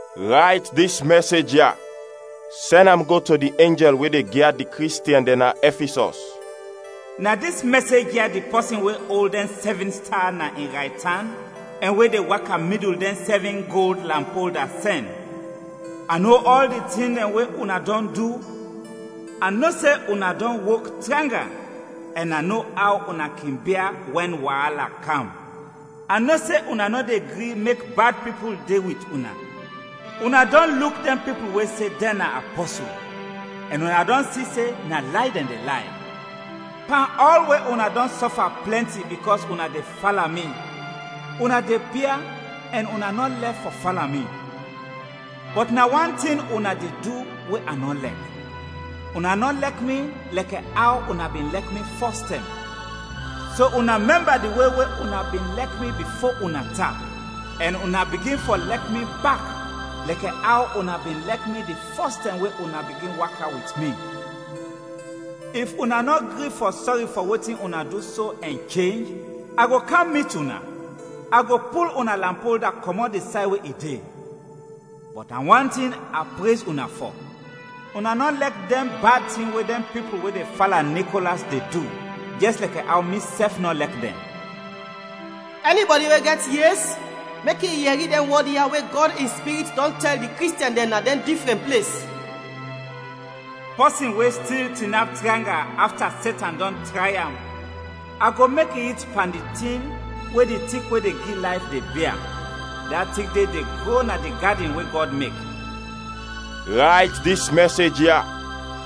“Rayt dis mɛsej ya sɛn am go to di enjɛl we de gyad di Kristiɛn dɛn na Ɛfisɔs: “Na dis mɛsej ya di pɔsin we ol dɛn sɛvin sta na in raytan ɛn we de waka midul dɛn sɛvin gold lampolda, sɛn: A no ɔl di tin dɛn we una dɔn du, a no se una dɔn wok tranga ɛn a no aw una kin bia wɛn waala kam. A no se una nɔ de gri mek bad pipul de wit una; una dɔn luk dɛn pipul we se dɛn na apɔsul ɛn una dɔn si se na lay dɛn de lay. Pan ɔl we una dɔn sɔfa plɛnti bikɔs una de fala mi, una de bia ɛn una nɔ lɛf fɔ fala mi. Bɔt na wan tin una de du we a nɔ lɛk, una nɔ lɛk mi lɛkɛ aw una bin lɛk mi fɔstɛm; so una mɛmba di we we una bin lɛk mi bifo una tap, ɛn una bigin fɔ lɛk mi bak lɛkɛ aw una bin lɛk mi di fɔs tɛm we una bigin waka wit mi. If una nɔ gri fɔ sɔri fɔ wetin una du so ɛn chenj, a go kam mit una, a go pul una lampolda kɔmɔt di say we i de; bɔt na wan tin a prez una fɔ, una nɔ lɛk dɛn bad tin we dɛn pipul, we de fala Nikolas, de du, jɛs lɛkɛ aw misɛf nɔ lɛk dɛn. “Ɛnibɔdi we gɛt yes, mek i yɛri dɛn wɔd ya we Gɔd in Spirit dɔn tɛl di Kristiɛn dɛn na dɛn difrɛn ples. “Pɔsin we stil tinap tranga afta Setan dɔn tray am, a go mek i it pan di tin we di tik we de gi layf de bia, da tik de de gro na di gadin we Gɔd mek. “Rayt dis mɛsej ya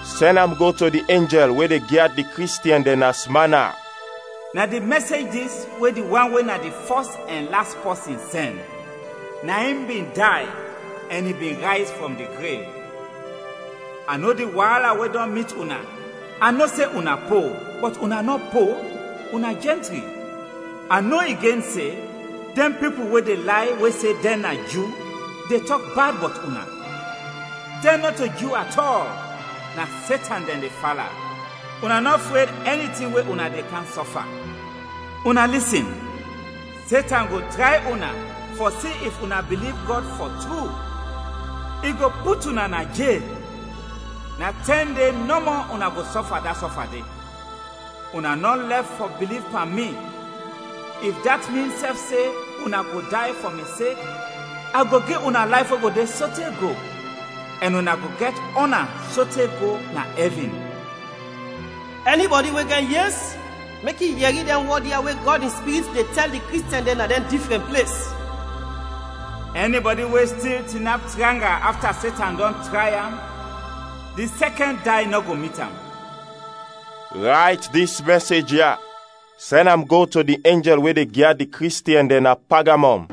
sɛn am go to di enjɛl we de gyad di Kristiɛn dɛn na Smana: “Na di mɛsej dis we di wan we na di fɔs ɛn las pɔsin, sɛn; na in bin day, ɛn i bin rayz frɔm di grev: A no di waala we dɔn mit una, a no se una po, bɔt una nɔ po, una jɛntri. A no igen se, dɛn pipul we de lay, we se dɛn na Ju, de tɔk bad bɔt una. Dɛn nɔto Ju atɔl, na Setan dɛn de fala. Una nɔ fred ɛni tin we una de kam sɔfa. Una lisin! Setan go tray una fɔ si if una biliv Gɔd fɔ tru, i go put una na jel. Na tɛn de nɔmɔ una go sɔfa da sɔfa de. Una nɔ lɛf fɔ biliv pan mi, if dat min sɛf se una go day fɔ mi sek, a go gi una layf we go de sote go, ɛn una go gɛt ɔna sote go na ɛvin. “Ɛnibɔdi we gɛt yes mek i yɛri dɛn wɔd ya we Gɔd in Spirit de tɛl di Kristiɛn dɛn na dɛn difrɛn ples. “Ɛnibɔdi we stil tinap tranga afta Setan dɔn tray am, di sɛkɛn day nɔ go mit am. “Rayt dis mɛsej ya sɛn am go to di enjɛl we de gyad di Kristiɛn dɛn na Pagamɔm: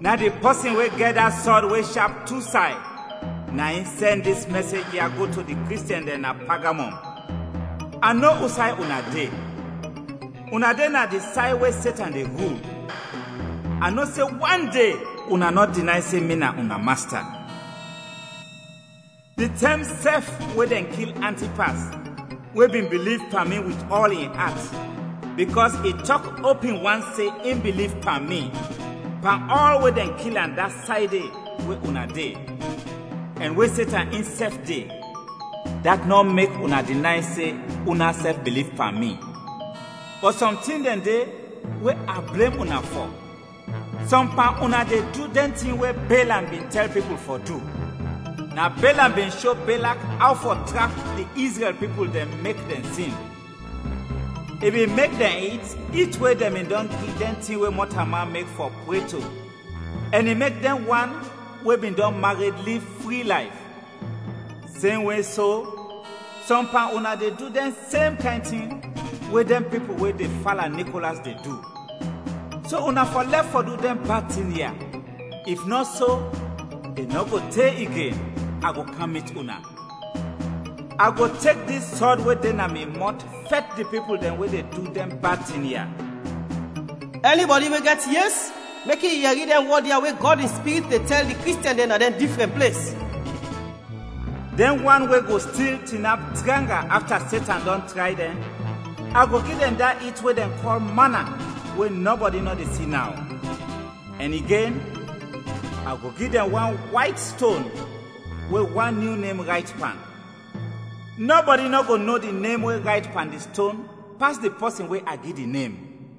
“Na di pɔsin we gɛt da sɔd we shap tu say, na in sɛn dis mɛsej ya go to di Kristiɛn dɛn na Pagamɔm: A no usay una de, una de na di say we Setan de rul. A no se wande una nɔ dinay se mi na una Masta. Di tɛm sɛf we dɛn kil Antipas we bin biliv pan mi wit ɔl in at bikɔs i tɔk opin wan se in biliv pan mi, pan ɔl we dɛn kil am da say de we una de, ɛn we Setan insɛf de, dat nɔ mek una dinay se unasɛf biliv pan mi. Bɔt sɔm tin dɛn de we a blem una fɔ, sɔm pan una de du dɛn tin we Belam bin tɛl pipul fɔ du; na Belam bin sho Belak aw fɔ trap di Izrɛl pipul dɛn mek dɛn sin. I bin mek dɛn it it we dɛn bin dɔn gi dɛn tin we mɔtalman mek fɔ pre to ɛn i mek dɛn wan we bin dɔn mared liv fri layf. Semwe so, sɔm pan una de du dɛn sem kayn tin we dɛn pipul we de fala Nikolas de du. So una fɔ lɛf fɔ du dɛn bad tin ya, if nɔ so, i nɔ go te igen, a go kam mit una, a go tek dis sɔd we de na mi mɔt fɛt di pipul dɛn we de du dɛn bad tin ya. “Ɛnibɔdi we gɛt yes, mek i yɛri dɛn wɔd ya we Gɔd in Spirit de tɛl di Kristiɛn dɛn na dɛn difrɛn ples. “Dɛn wan we go stil tinap tranga afta Setan dɔn tray dɛn, a go gi dɛn da it we dɛn kɔl mana we nɔbɔdi nɔ de si naw. Ɛn igen, a go gi dɛn wan wayt ston we wan nyu nem rayt pan. Nɔbɔdi nɔ go no di nem we rayt pan di ston pas di pɔsin we a gi di nem.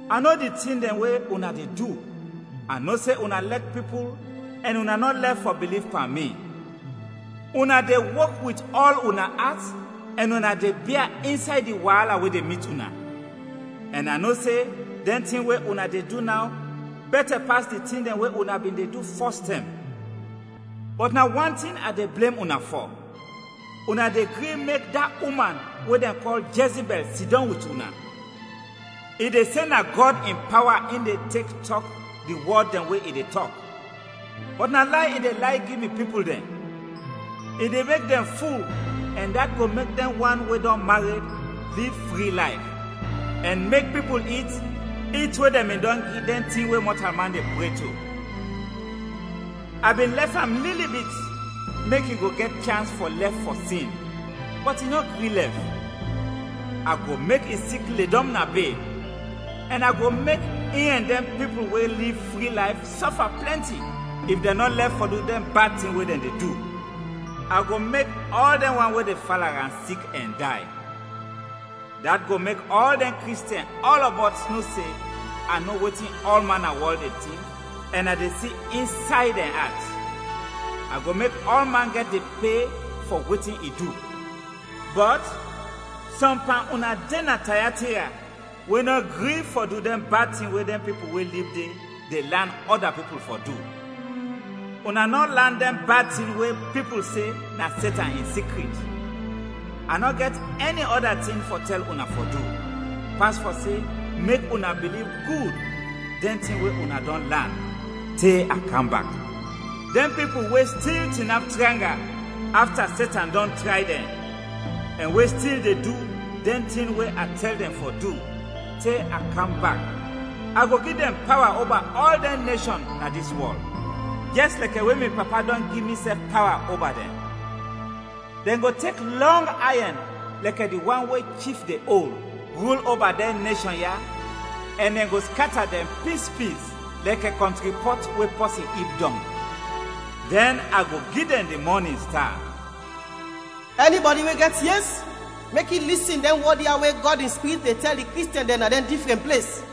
A no di tin dɛn we una de du, a no se una lɛk pipul ɛn una nɔ lɛf fɔ biliv pan mi, una de wok wit ɔl una at ɛn una de bia insay di waala we de mit una. Ɛn a no se dɛn tin we una de du naw bɛtɛ pas di tin dɛn we una bin de du fɔstɛm. Bɔt na wan tin a de blem una fɔ, una de gri mek da uman we dɛn kɔl Jɛzibɛl sidɔm wit una. I de se na Gɔd in pawa in de tek tɔk di wɔd dɛn we i de tɔk, bɔt na lay i de lay gi mi pipul dɛn; i de mek dɛn ful ɛn dat go mek dɛn wan we dɔn mared, liv fri layf; ɛn mek pipul it it we dɛn bin dɔn gi dɛn tin we mɔtalman de pre to. A bin lɛf am lili bit mek i go gɛt chans fɔ lɛf fɔ sin, bɔt i nɔ gri lɛf. A go mek i sik ledɔm na bed, ɛn a go mek in ɛn dɛn pipul we liv fri layf sɔfa plɛnti if dɛn nɔ lɛf fɔ du dɛn bad tin we dɛn de du. A go mek ɔl dɛn wan we de fala am sik ɛn day. Dat go mek ɔl dɛn Kristiɛn ɔlɔbɔt no se a no wetin ɔlman na wɔl de tink ɛn a de si insay dɛn at. A go mek ɔlman gɛt di pe fɔ wetin i du. “Bɔt, sɔm pan una de na Tayatira, we nɔ gri fɔ du dɛn bad tin we dɛn pipul we lib de, de lan ɔda pipul fɔ du; una nɔ lan dɛn bad tin we pipul se na Setan in sikrit. A nɔ gɛt ɛni ɔda tin fɔ tɛl una fɔ du, pas fɔ se mek una biliv gud dɛn tin we una dɔn lan, te a kam bak. Dɛn pipul we stil tinap tranga afta Setan dɔn tray dɛn, ɛn we stil de du dɛn tin we a tɛl dɛn fɔ du, te a kam bak, a go gi dɛn pawa oba ɔl dɛn neshɔn na dis wɔl, jɛs lɛkɛ we mi Papa dɔn gi misɛf pawa oba dɛn. Dɛn go tek lɔng ayɛn lɛkɛ di wan we chif de ol, rul oba dɛn neshɔn ya ɛn dɛn go skata dɛn pispis lɛkɛ kɔntri pɔt we pɔsin ib dɔng. Dɛn a go gi dɛn di mɔnin sta. “Ɛnibɔdi we gɛt yes, mek i lisin dɛn wɔd ya we Gɔd in Spirit de tɛl di Kristiɛn dɛn na dɛn difrɛn ples.